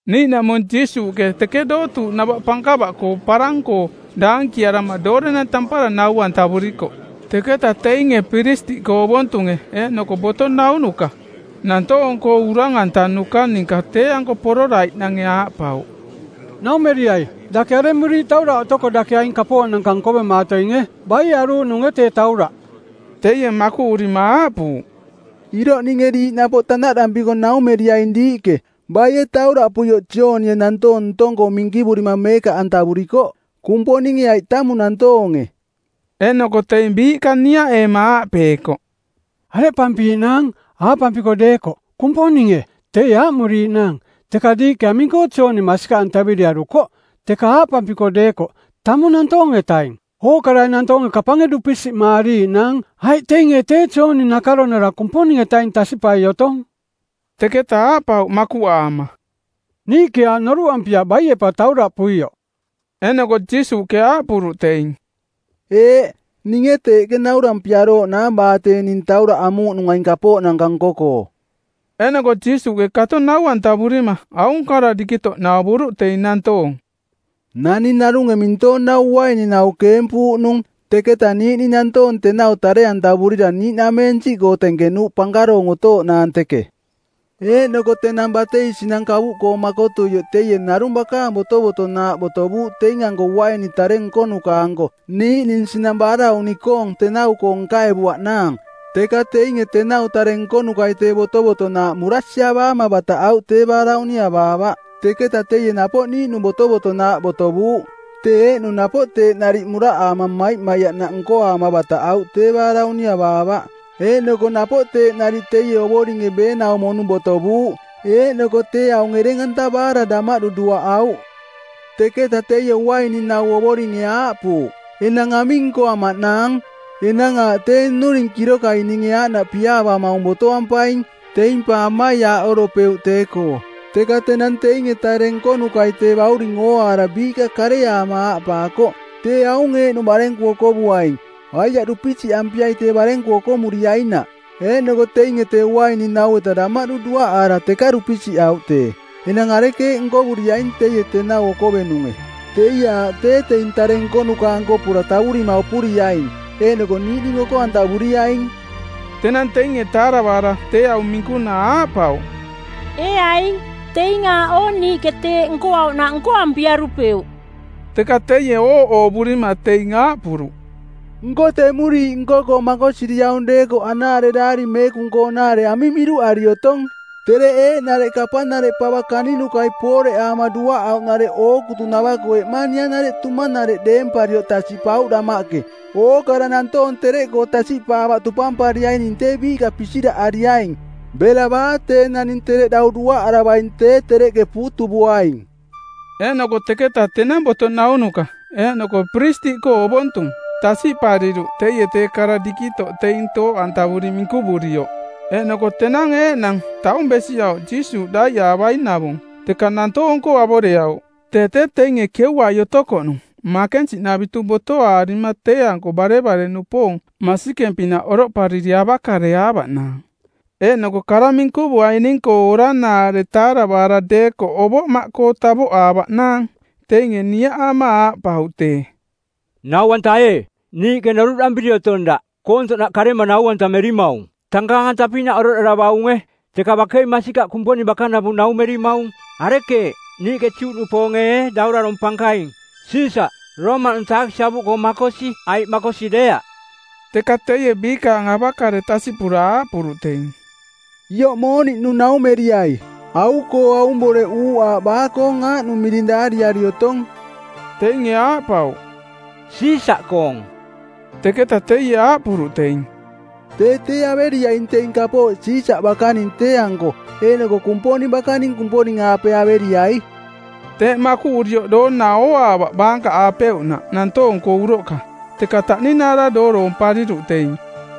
Niiꞌnaꞌmung Jiisuuꞌke teke dootuuꞌnava pankava-koong parang-koo daankiarama doorenang tampara nau-antavurikoꞌ; Teketa teinge piristiꞌkoo ovontung eeꞌnoko boto naunuka, nantoong-koo urang-antanuka ninka tee-anko pororaiꞌnange aaꞌpauꞌ, “Naumeriai dake aremuriiꞌ tauraꞌ otoko dake aing kapooꞌnanka nkovemaatoinge, baie aruuꞌnunge tee tauraꞌ?” Teie makuꞌurima aaꞌpuuꞌ, “Iroꞌ ninge diiꞌ napoꞌ tanaꞌdampiko naumeriaing diiꞌke. Baie tauraꞌpuioꞌ Joonie nantoong ntong-koo minkivurima meekaꞌantavurikoꞌ, Kumponinge aiꞌ tamung nantoonge?” Eeꞌnoko teing biiꞌka niaꞌeema aaꞌpeekoꞌ, “Areꞌpampiaꞌnaang? Aaꞌpampiko deekoꞌ, ‘Kumponinge,’ teie aaꞌmuriiꞌnaang, ‘Teka diiꞌke aming-koo Jooni masikaꞌantaveriarukoꞌ?’ Teka aaꞌpampiko deekoꞌ, ‘Tamung nantoong-etaing,’ ookarai nantoonge kapange dupisiꞌmaariiꞌnaang, aiꞌ teinge tee Jooni nakaronara Kumponing-etaing tasiꞌpai otong.” Teketa aaꞌpauꞌ makuꞌaama, “Niiꞌke aaꞌ noruꞌampiaꞌ baie pa tauraꞌpuioꞌ.” Eeꞌnoko Jiisuuꞌke aaꞌpuruꞌ teing, “Eeꞌ, ninge teeꞌke naurampiarooꞌnaang baa tee ning tauraꞌ amuuꞌnung aing kapooꞌnanka nko-koo.” Eeꞌnoko Jiisuuꞌke kato nau-antavurima aung kara dikitoꞌ nauvuruꞌ teing nantoong, “Naning narunge mintoonau uaininau keempuuꞌnung, teketa niiꞌning nantoong tenau tare-antavurira niiꞌnameensiꞌkoo tenkenuuꞌ pankaroong otooꞌnaang teke. Eeꞌnoko tenang batei sinang kavuꞌkoong makotuioꞌ teie narung bakaang botovotonaaꞌ botovuuꞌ teing-anko uaini tare nkonuka-anko niiꞌning sinang baarauni-koong˜ tenau-koo nkaevuaꞌnaang. Teka teinge tenau tare nkonukai tee botovotonaaꞌ murasiavaama bataꞌauꞌ tee baarauni avaavaꞌ. Teketa teie napoꞌ niiꞌnung botovotonaaꞌ botovuuꞌ. Tee eeꞌnung napoꞌ teeꞌ nariꞌ muraꞌaama maimaiaꞌnaꞌ nkoaama bataꞌauꞌ tee baarauni avaavaꞌ. Eeꞌnoko napoꞌ teeꞌ nariꞌ teie ovoringe beenaumo-nung botovuuꞌ, eeꞌnoko tee aung ereng-antavaara damaꞌdu duaꞌauꞌ. “Teketa teie uaininau ovoringe aaꞌpuuꞌ, ‘Enang aming nkoamaꞌnaang? Enang aaꞌ tee nnuring kirokai ninge aaꞌnaꞌ piaavamaung botoampaing. Teing pa amaiaaꞌoropeuꞌ tee-koo.’ Teka tenang teinge tare nkonukai tee bauring ooaara biiꞌka kareaama aaꞌpaakoꞌ, ‘Tee aung eeꞌnung barenku okovuaing. Aiaꞌ dupisiꞌampiai tee barenku okomuriainaꞌ.’ Eeꞌnoko teinge tee uaininau-eta damaꞌdu duaꞌaara teka dupisiꞌauꞌ tee. Enang arekeeꞌ nkovuriaing teie tenau okovenunge? Teie aaꞌ tee teing tare nkonuka-anko pora tavurima opuriaing, eeꞌnoko niiꞌning oko-antavuriaing.” Tenang teinge taaravaara tee aung minkunaa aaꞌpauꞌ, “Ee aing, teing aaꞌ oo niiꞌke teeꞌ nkoauꞌnaꞌ nkoampiarupeuꞌ.” Teka teie ooꞌoovurima teing aaꞌpuruꞌ, “Nko temuriiꞌ nko-koo makosiriaung deekoꞌ anaare Daari Meekung-koonaare aming miruꞌari otong, ‘Tereꞌ eeꞌnareꞌ kapanareꞌ pava kaninukai pooreꞌaama duaꞌauꞌnareꞌ ookutunava-koo eꞌmanianareꞌ tumanareꞌ deemparioꞌ tasiꞌpauꞌ damaꞌke.’? Ookara nantoong tereꞌkoo tasiꞌpaavaꞌ tupampariaining tee biiꞌka pisiraꞌariaing, bera baa tee naning tereꞌ dau duaꞌaravaing tee tereꞌke puutuvuaing.” Eeꞌnoko teketa tenang boto naunuka eeꞌnoko piristiꞌkoo ovontung tasiꞌpariruꞌ teie tee kara dikitoꞌ teing tooꞌantavuri minkuvurioꞌ. Eeꞌnoko tenang eeꞌnang taung besiꞌauꞌ Jiisuuꞌ daiꞌaavainavung, teka nantoong-koo avoreauꞌ. Tee tee teinge keuai otokoꞌnung makensiꞌnavitu botoaarima tee-anko barevare-nupoong masikeng-pinaꞌ oroꞌpariri avakareaavaꞌnaang, eeꞌnoko kara minkuvuaining-koo oranaare taaravaara deekoꞌ ovoꞌmaꞌkoo tavoꞌaavaꞌnaang. Teinge niaꞌaama aaꞌpauꞌ tee, “Nau-anta ee, niiꞌke noruꞌdampiri otong daꞌ koontoꞌnaꞌ karema nau-antamerimaung, tankaang-anta-pinaꞌ oroꞌdaravaunge, teka bakei masikaꞌ Kumponing bakanavung naumerimaung. Arekeeꞌ, niiꞌke Juꞌnupoonge ee daurarong˜ pankaing, Siisaꞌ, Roomaꞌnung taakisi avuꞌkoo makosi aiꞌ makosi deeaꞌ?” Teka teie biikaang avakare tasiꞌpura aaꞌpuruꞌ teing, “Ioꞌ mooniꞌnu naumeriai. Au-koo aung boreꞌ uuꞌaaꞌ baa-koong aaꞌnung miring daariari otong?” Teinge aaꞌpauꞌ, “Siisaꞌkoong.” Teketa teie aaꞌpuruꞌ teing, “Tee tee averiaing teing kapooꞌ Siisaꞌ bakaning tee-anko eeꞌnoko Kumponing bakaning Kumponing-aape averiai.” Teeꞌ makuꞌurioꞌ doona ooaavaꞌ baankaꞌaapeuꞌnaꞌ nantoong-koo uroꞌka, teka taꞌninaara dooroompariruꞌ teing.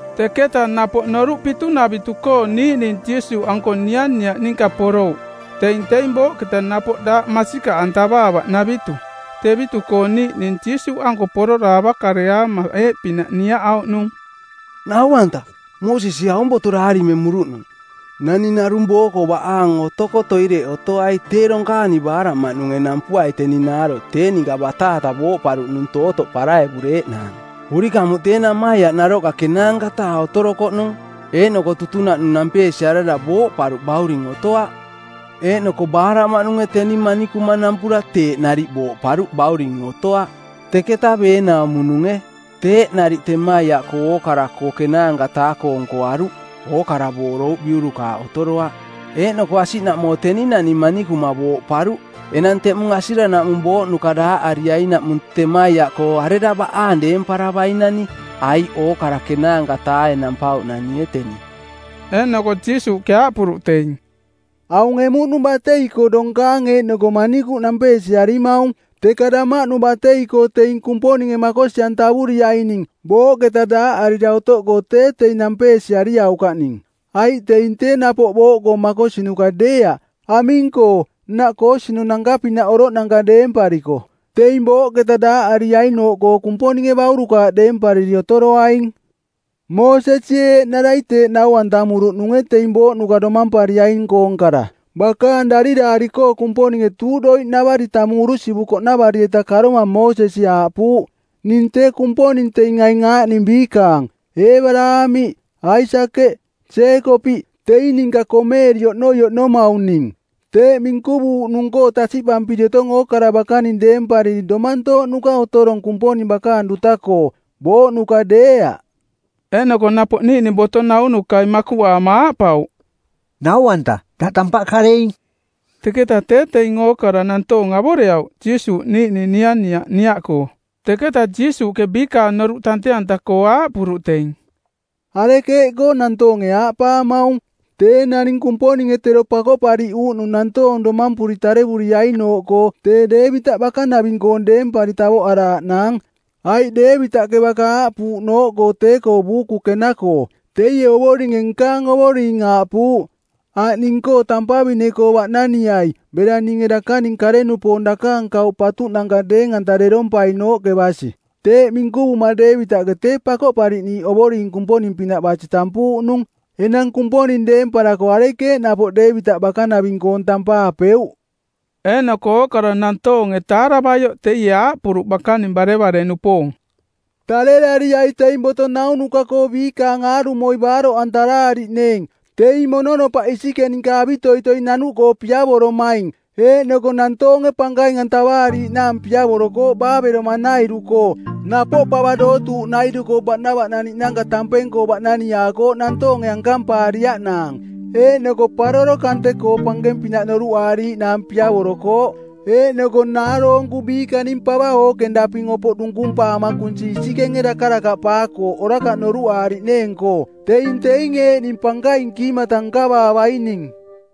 Teketa napoꞌ Noruꞌ Pitunavitu-koong˜ niiꞌning Jiisuuꞌanko nianiaꞌ ninka porouꞌ. Teing teing booꞌketa napoꞌ daaꞌ masikaꞌantavaavaꞌnavitu. Tevitu-koo niiꞌning Jiisuuꞌanko porora avakareaama eeꞌpinaꞌ niaꞌauꞌnung, “Nau-anta, Mosesie aung boto daarimemuruꞌnung, ‘Naning narung booko baꞌaang otoko toireꞌ otoai tee donkaani baaraꞌmaꞌnunge nampuai teni naaro tee ninka bataata booꞌparuꞌnung tootoꞌ paravevureeꞌnaang.’ Urikamuꞌ tee namaiaꞌ naroꞌka ˜kenaanka-taa otorokoꞌnung. Eeꞌnoko tutunaꞌnung nampeesiarara booꞌparuꞌ bauring otoaꞌ. Eeꞌnoko baaraꞌmaꞌnunge teni manikuma nampura teeꞌ nariꞌ booꞌparuꞌ bauring otoaꞌ. Teketa beenaumo-nunge; Teeꞌ nariꞌ temaiaꞌkoo ookara-koo ˜kenaanka-taa-koo nkoaruꞌ. Ookara boorouꞌ biurukaaꞌ otoroaꞌ. Eeꞌnoko asiꞌnaꞌmoo teni nani manikuma booꞌparuꞌ. Enang teꞌmung asiranaꞌmung booꞌnuka daaꞌariainaꞌmung temaiaꞌkoo arera baꞌaang deemparavainani? Aiꞌ ookara ˜kenaanka-taae nampauꞌnanie teni.” Eeꞌnoko Jiisuuꞌke aaꞌpuruꞌ teing, “Aung emuꞌnung batei-koo donkaang eeꞌnoko manikuꞌ nampeesiarimaung, teka damaꞌnung batei-koo teing Kumponinge makosi-antavuriaining booꞌketa daaꞌarira otoꞌkoo tee teing nampeesiariaukaꞌning, aiꞌ teing tee napoꞌ booꞌkoo makosinuka deeaꞌ; aming-koo, nnaꞌ koosinunanka-pinaꞌ oroꞌnanka deempariko. Teing booꞌketa daaꞌariainooꞌkoo Kumponinge baurukaaꞌ deempariri otoroaing. Moosesie eeꞌnarai teeꞌ nau-antamuruꞌnunge teing booꞌnuka domampariaing-koong kara. Bakaang dariraari-koo Kumponinge tuuꞌdoiꞌnavari tamung urusivukoꞌnavari-eta karoma Moosesi aaꞌpuuꞌ, ‘Ning tee Kumponing teing aing aaꞌning biikaang: Eebaraamiꞌ, Aisakeꞌ, Jeekopiꞌ. Teing ninka komeeri Oꞌnoi Oꞌnomaung ning.’ Teeꞌ minkuvuuꞌnung-koo tasiꞌpampiri otong ookara bakaning deempariri domantooꞌnuka otorong Kumponing bakaang duta-koo, booꞌnuka deeaꞌ.” Eeꞌnoko napoꞌ niiꞌning boto naunukai makuꞌaama aaꞌpauꞌ, “Nau-anta, daꞌ tampaꞌ kareing.” Teketa tee, teing ookara nantoong avoreauꞌ Jiisuuꞌ niiꞌning nianiaꞌ niaꞌkoo. Teketa Jiisuuꞌke biikaang noruꞌ tante-anta-koo aaꞌpuruꞌ teing, “Arekeeꞌkoo nantoonge aaꞌpaamaung, ‘Tee naning Kumponinge tero Pakoꞌpariꞌuuꞌnung nantoong domampuri tarevuriainooꞌkoo tee Deevitaꞌ bakanaving-koong deempari tavoꞌaraaꞌnaang.’? Aiꞌ Deevitaꞌke baka aaꞌpuuꞌnooꞌkoo tee-koo Buuku Kena-koo, ‘Teie Ovoringe nkaang Ovoring aaꞌpuuꞌ, “Aꞌ ning-koo tampavine-koo baꞌnaniai bera ninge dakaning kare-nupoong dakaang kauꞌ patuꞌnanka deeng-antarerompainooꞌke basi.” ’ Teeꞌ minkuvuma Deevitaꞌke tee Pakoꞌpariꞌniiꞌ Ovoring Kumponing-pinaꞌ basi tampuuꞌnung. Enang Kumponing deemparako arekeeꞌ napoꞌ Deevitaꞌ bakanaving-koong tampaapeuꞌ?” Eeꞌnoko ookara nantoonge taaravaioꞌ teie aaꞌpuruꞌ bakaning barevare-nupoong, “Tarerariai teing boto naunuka-koo biikaang aarumoi baaroꞌantaraariꞌneeng. Teing mononopaꞌ isikeng ninka avitoitoi nanuꞌkoo piavoromaing. Eeꞌnoko nantoonge pankaing-antavaariiꞌnaang piavorokooꞌ baaveromanairu-koo. Napoꞌ pava dootuuꞌnairu-koo baꞌnavaꞌnaniꞌnanka tampeng-koo baꞌnaniaakooꞌ nantoonge ankampaariaꞌnaang, eeꞌnoko paroro kante-koo pankeng-pinaꞌ noruꞌaariiꞌnaang piavorokooꞌ. Eeꞌnoko naaroonku biikaning pava ookeng daping opoꞌ dunkumpaama kunsi isikenge dakarakaꞌpaakooꞌ orakaꞌ noruꞌaariꞌneeng-koo. Teing teing eeꞌning pankaing kiimata nkavaavaining.”